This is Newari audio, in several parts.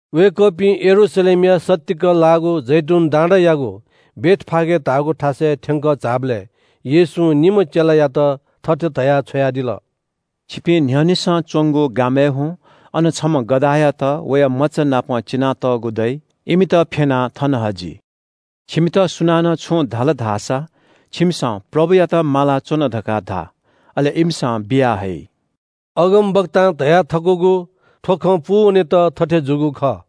वय्‌कःपिं यरूशलेमया सत्तीक लाःगु जैतून डाँडायागु बेथफागे धाःगु थासय् थ्‍यंकः झाःबलय् येशूं निम्‍ह चेलायात थथे धयाः छ्वयादिल – “छिपिं न्‍ह्यःनेसं च्‍वंगु गामय् हुँ। अन छम्‍ह गधायात वया मचानापं चिनातःगु दइ। इमित फ्‍यनाः थन हजि। छिमित सुनानं छुं धाल धाःसा छिमिसं – ‘प्रभुयात माला च्‍वन’ धकाः धा। अले इमिसं बिया हइ।” अगमवक्तां धयाथकूगु थ्‍व खँ पूवनेत थथे जूगु खः –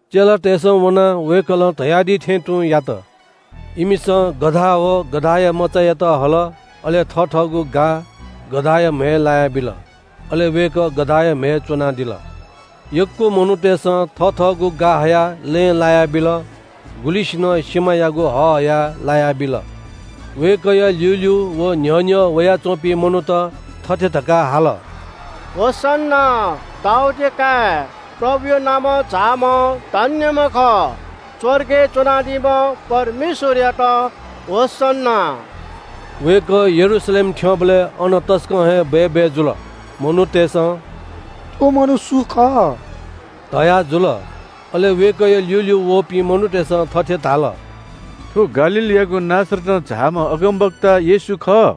चेलातय्‌सं वनाः वय्‌कलं धयादी थें तुं यात। इमिसं गधा व गधाया मचायात हल, अले थथःगु गा गधाया म्‍हय् लायाबिल। अले वय्‌कः गधाया म्‍हय् च्‍वनादिल। यक्‍व मनूतय्‌सं थथःगु गा हयाः लँय् लायाबिल। गुलिसिनं सिमायागु हः हयाः लायाबिल। वय्‌कःया ल्‍यूल्‍यू व न्‍ह्यः न्‍ह्यः वयाच्‍वंपिं मनूत थथे धकाः हाल – “होसन्‍ना, दाऊदया काय्, प्रभुया नामं झाःम्‍ह धन्‍यम्‍ह खः। स्‍वर्गय् च्‍वनादीम्‍ह परमेश्‍वरयात होसन्‍ना।” वय्‌कः यरूशलेम थ्‍यंबलय् अन तसकं हे बय्‌बय् जुल। मनूतय्‌सं – “थ्‍व मनू सु खः?” धयाजुल। अले वय्‌कःया ल्‍यूल्‍यू वःपिं मनूतय्‌सं थथे धाल – “थ्‍व गालीलयागु नासरतं झाःम्‍ह अगमवक्ता येशू खः।”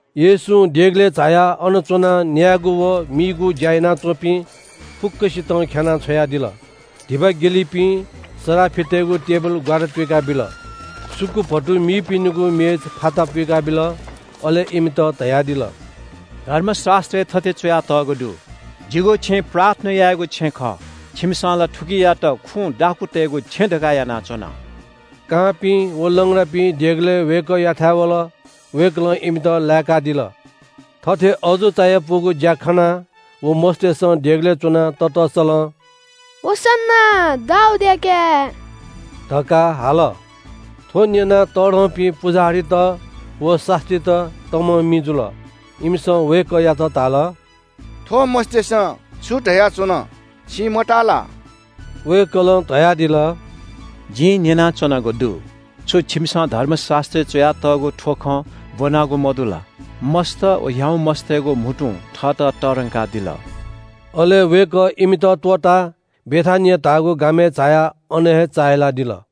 येशूं देगलय् झायाः अन च्‍वनाः न्‍यायेगु व मीगु ज्‍या यानाच्‍वंपिं फुक्‍कसितं ख्‍याना छ्वयादिल। धिबा ग्‍यलिपिं सराफितय्‌गु टेबिल ग्‍वारा तुइकाबिल, सुकुभतु मीपिनिगु मेच फाता पुइकाबिल। अले इमित धयादिल – “धर्मशास्‍त्रय् थथे च्‍वयातःगु दु – ‘जिगु छेँ प्रार्थना यायेगु छेँ खः।’ छिमिसं ला थुकियात खुँ दाखुँतय्‌गु छेँ धकाः यानाच्‍वन।” कांपिं व लंग्रापिं देगलय् वय्‌कःयाथाय् वल। वय्‌कलं इमित लाय्‌कादिल। थथे अजू चायापुगु ज्‍या खनाः व मस्‍तय्‌सं देगलय् च्‍वनाः ततःसलं “होसन्‍ना, दाऊदया काय्” धकाः हाल। थ्‍व न्‍यनाः तःधंपिं पुजाहारीत व शास्‍त्रीत तमं मि जुल। इमिसं वय्‌कःयात धाल – “थ्‍व मस्‍तय्‌सं छु धयाच्‍वन, छिं मताः ला?” वय्‌कलं धयादिल – “जिं न्‍यनाच्‍वनागु दु। छु छिमिसं धर्मशास्‍त्रय् च्‍वयातःगु थ्‍व खँ ब्‍वनागु मदु ला? ‘मस्‍त व ह्याउँमस्‍तय्‌गु म्‍हुतुं थःत तःधंकादिल।’” अले वय्‌कः इमित त्‍वःताः बेथानिया धाःगु गामय् झायाः अन हे चाहिलादिल।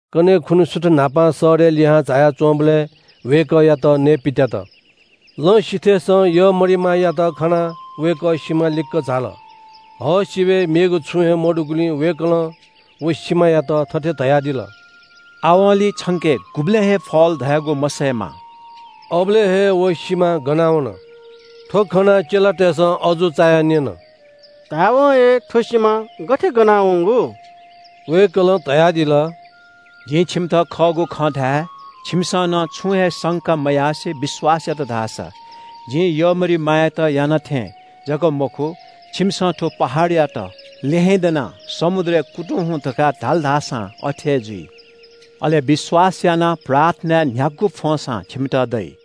कन्‍हय् खुन्‍हु सुथ न्‍हापां शहरय् लिहां झाया च्‍वंबलय् वय्‌कःयात नयेपित्‍यात। लँ सिथय्‌सं यःमरिमायात खनाः वय्‌कः सिमा लिक्‍क झाल। हः सिबय् मेगु छुं हे मदुगुलिं वय्‌कलं व सिमायात थथे धयादिल – “आवंलि छंके गुबलें हे फल धयागु मसयेमा।” अबलय् हे व सिमा गना वन। थ्‍व खनाः चेलातय्‌सं अजू चायाः न्‍यन – “धायेवं हे थ्‍व सिमा गथे गनावंगु?” वय्‌कलं धयादिल – “जिं छिमित खःगु खँ धाये – छिमिसं नं छुं हे संका मयासें विश्‍वास यात धाःसा जिं यःमरिमायात याना थें जक मखु, छिमिसं थ्‍व पहाडयात – ‘ल्‍यहेँ दनाः समुद्रय् कुतुं हुँ’ धकाः धाल धासां अथे हे जुइ। अले विश्‍वास यानाः प्रार्थनाय्‌ न्‍ह्यागु फ्‍वंसां छिमित दइ।”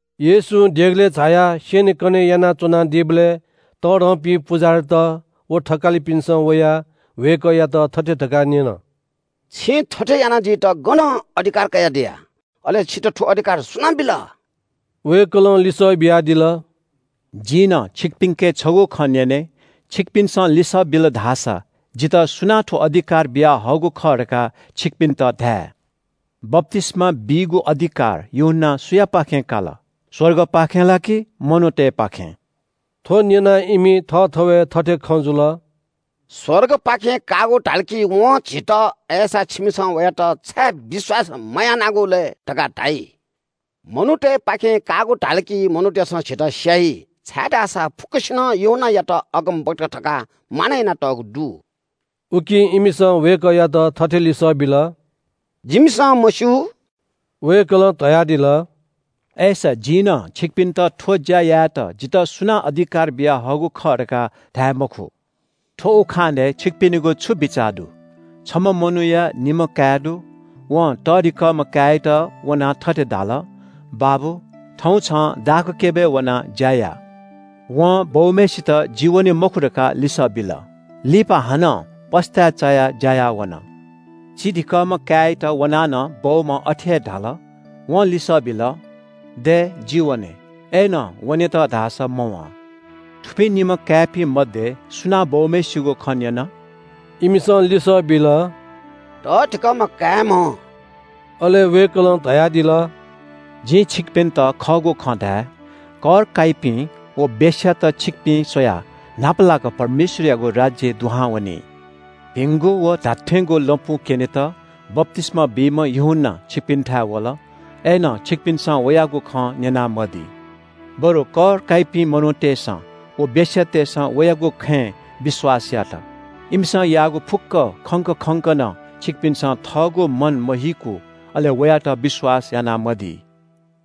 येशूं देगलय् झायाः स्‍यनेकने यानाच्‍वनादीबलय् तःधंपिं पुजाहारीत व थकालिपिन्‍सं वयाः वय्‌कःयात थथे धकाः न्‍यन – “छिं थथे यानादीत गनं अधिकार कयादिया? अले छितः थ्‍व अधिकार सुनां बिल?” वय्‌कलं लिसः बियादिल – “जिं नं छिकपिन्‍के छगू खँ न्‍यने, छिकपिन्‍सं लिसः बिल धाःसा जितः सुनां थ्‍व अधिकार बियाहःगु खः धकाः छिकपिन्‍त धाये – बप्‍तिस्‍मा बीगु अधिकार यूहन्‍नां सुयापाखें काल? स्‍वर्गपाखें ला कि मनूतय्‌पाखें?” थ्‍व न्‍यनाः इमि थःथवय् थथे खँ जुल – “‘स्‍वर्गपाखें काःगु’ धाल कि वं झीत ‘अय्‌सा, छिमिसं वयात छाय् विश्‍वास मयानागु लय्?’ धकाः धाइ। ‘मनूतय्‌पाखें काःगु’ धाल कि मनूतय्‌सं झीत स्‍याइ, छाय्‌धाःसा फुक्‍कसिनं यूहन्‍नायात अगमवक्ता धकाः मानय् यानातःगु दु।” उकिं इमिसं वय्‌कःयात थथे लिसः बिल – “जिमिसं मस्‍यू।” वय्‌कलं धयादिल – “अय्‌सा जिं नं छिकपिन्‍त थ्‍व ज्‍या यायेत जितः सुनां अधिकार बियाहःगु खः धकाः धाये मखु।” “थ्‍व उखानय् छिकपिनिगु छु बिचाः दु? छम्‍ह मनूया निम्‍ह काय् दु। वं तःधिकःम्‍ह काय्‌यात वनाः थथे धाल – ‘बाबु, थौं छं दाखक्‍यबय् वनाः ज्‍या या।’ वं बौम्‍हय्‌सित ‘जि वने मखु’ धकाः लिसः बिल। लिपा हानं पस्‍ताय् चायाः ज्‍या याः वन। चिधिंकःम्‍ह काय्‌यात वनाः नं बौम्‍हं अथे हे धाल। वं लिसः बिल – ‘दय्, जि वने,’ अय्‌नं वनेत धाःसा मवं। “थुपिं निम्‍ह काय्‌पिं मध्‍ये सुनां बौम्‍हय्‌सिगु खँ न्‍यन?” इमिसं लिसः बिल – “तःधिकःम्‍ह काय्‌म्‍हं।” अले वय्‌कलं धयादिल – “जिं छिकपिन्‍त खःगु खँ धाये – कर काइपिं व वेश्‍यात छिकपिं स्‍वयाः न्‍हापालाक परमेश्‍वरयागु राज्‍यय् दुहां वनी। भिंगु व धात्‍थेंगु लँपु क्‍यनेत बप्‍तिस्‍मा बीम्‍ह यूहन्‍ना छिकपिन्‍थाय् वल, अय्‌नं छिकपिन्‍सं वयागु खँ न्‍यनामदी। बरु कर काइपिं मनूतय्‌सं व वेश्‍यातय्‌सं वयागु खँय् विश्‍वास यात। इमिसं याःगु फुक्‍कं खंक खंक नं छिकपिन्‍सं पश्‍चाताप मयात धाःसा अले वयात विश्‍वास यानामदी।”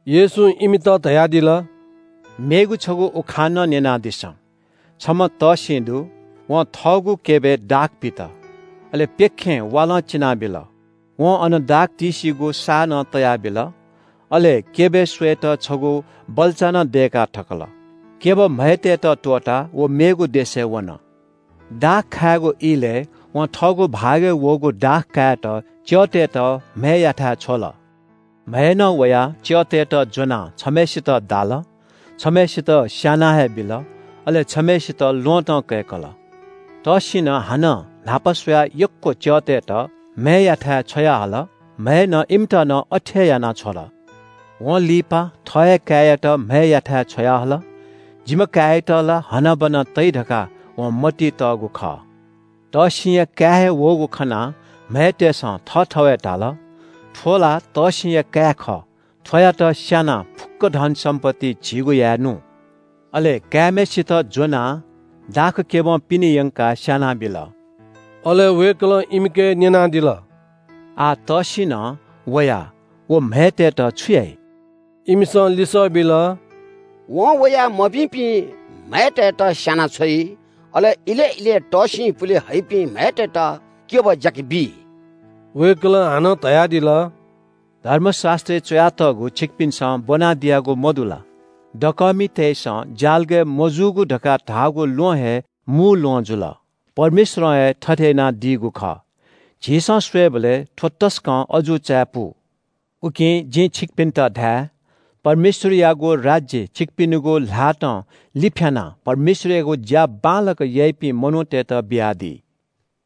येशूं इमित धयादिल – “मेगु छगू उखान नं न्‍यनादिसँ – छम्‍ह तःसिं दु। वं थःगु क्‍यबय् दाख पित। अले प्‍यखें वालं चिनाबिल। वं अन दाख तिसीगु साः नं तयाबिल। अले क्‍यबय् स्‍वयेत छगू बल्‍चा नं दय्‌का थकल। क्‍यब म्‍हय्‌तय्‌त त्‍वःताः व मेगु देशय् वन। दाख खायेगु इलय् वं थःगु भागय् वःगु दाख कायेत च्‍यःतय्‌त म्‍हय्‌याथाय् छ्वल। म्‍हय्‌नं वया च्‍यःतय्‌त ज्‍वनाः छम्‍हय्‌सित दाल, छम्‍हय्‌सित स्‍याना हे बिल, अले छम्‍हय्‌सित ल्‍वहँतं कय्‌कल। तःसिनं हानं न्‍हापा स्‍वयाः यक्‍व च्‍यःतय्‌त म्‍हय्‌याथाय् छ्वयाहल। म्‍हय्‌नं इमित नं अथे हे यानाछ्वल। “वं लिपा थः हे काय्‌यात म्‍हय्‌याथाय् छ्वयाहल। ‘जिम्‍ह काय्‌यात ला हनाबना तइ’ धकाः वं मतिइ तःगु खः। “तःसिंया काय् हे वःगु खनाः म्‍हय्‌तय्‌सं थःथवय् धाल, ‘थ्‍व ला तःसिंया काय् खः, थ्‍वयात स्‍यानाः फुक्‍क धनसम्‍पत्ति झीगु यायेनु।’ अले काय्‌म्‍हय्‌सित ज्‍वनाः दाखक्‍यबं पिने यंकाः स्‍यानाबिल।” अले वय्‌कलं इमिके न्‍यनादिल – “आः तःसिंनं वयाः व म्‍हय्‌तय्‌त छु याइ?” इमिसं लिसः बिल – “वं वयाः मभिंपिं म्‍हय्‌तय्‌त स्‍यानाछ्वइ। अले इलय् इलय् तःसिं पुले हइपिं म्‍हय्‌तय्‌त क्‍यब ज्‍याके बी।” वय्‌कलं हानं धयादिल – “धर्मशास्‍त्रय् च्‍वयातःगु छिकपिन्‍सं ब्‍वनादियागु मदु ला? “‘दकःमितय्‌सं ज्‍यालगय् मजूगु धकाः धाःगु ल्‍वहं हे मू ल्‍वहं जुल। परमेश्‍वरं हे थथे यानादीगु खः। झीसं स्‍वयेबलय् थ्‍व तसकं अजू चायापु।’” “उकिं जिं छिकपिन्‍त धाये – परमेश्‍वरयागु राज्‍य छिकपिनिगु ल्‍हातं लिफ्‍यानाः परमेश्‍वरयागु ज्‍या बांलाक याइपिं मनूतय्‌त बियादी।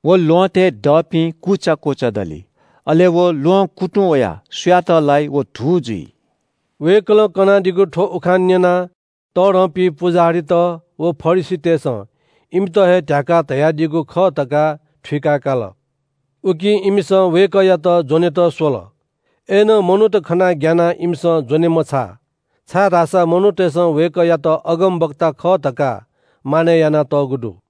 व ल्‍वहँतय् दःपिं कुचा कुचा दली। अले व ल्‍वहं कुतुं वयाः सुयात लाइ, व धू जुइ।” वय्‌कलं कनादीगु थ्‍व उखान न्‍यनाः तःधंपिं पुजाहारीत व फरिसीतय्‌सं इमित हे ध्‍याकाः धयादीगु खः धकाः थुइका काल। उकिं इमिसं वय्‌कःयात ज्‍वनेत स्‍वल। अय्‌नं मनूत खनाः ग्‍यानाः इमिसं ज्‍वने मछाः, छाय्‌धाःसा मनूतय्‌सं वय्‌कःयात अगमवक्ता खः धकाः मानय् यानातःगु दु।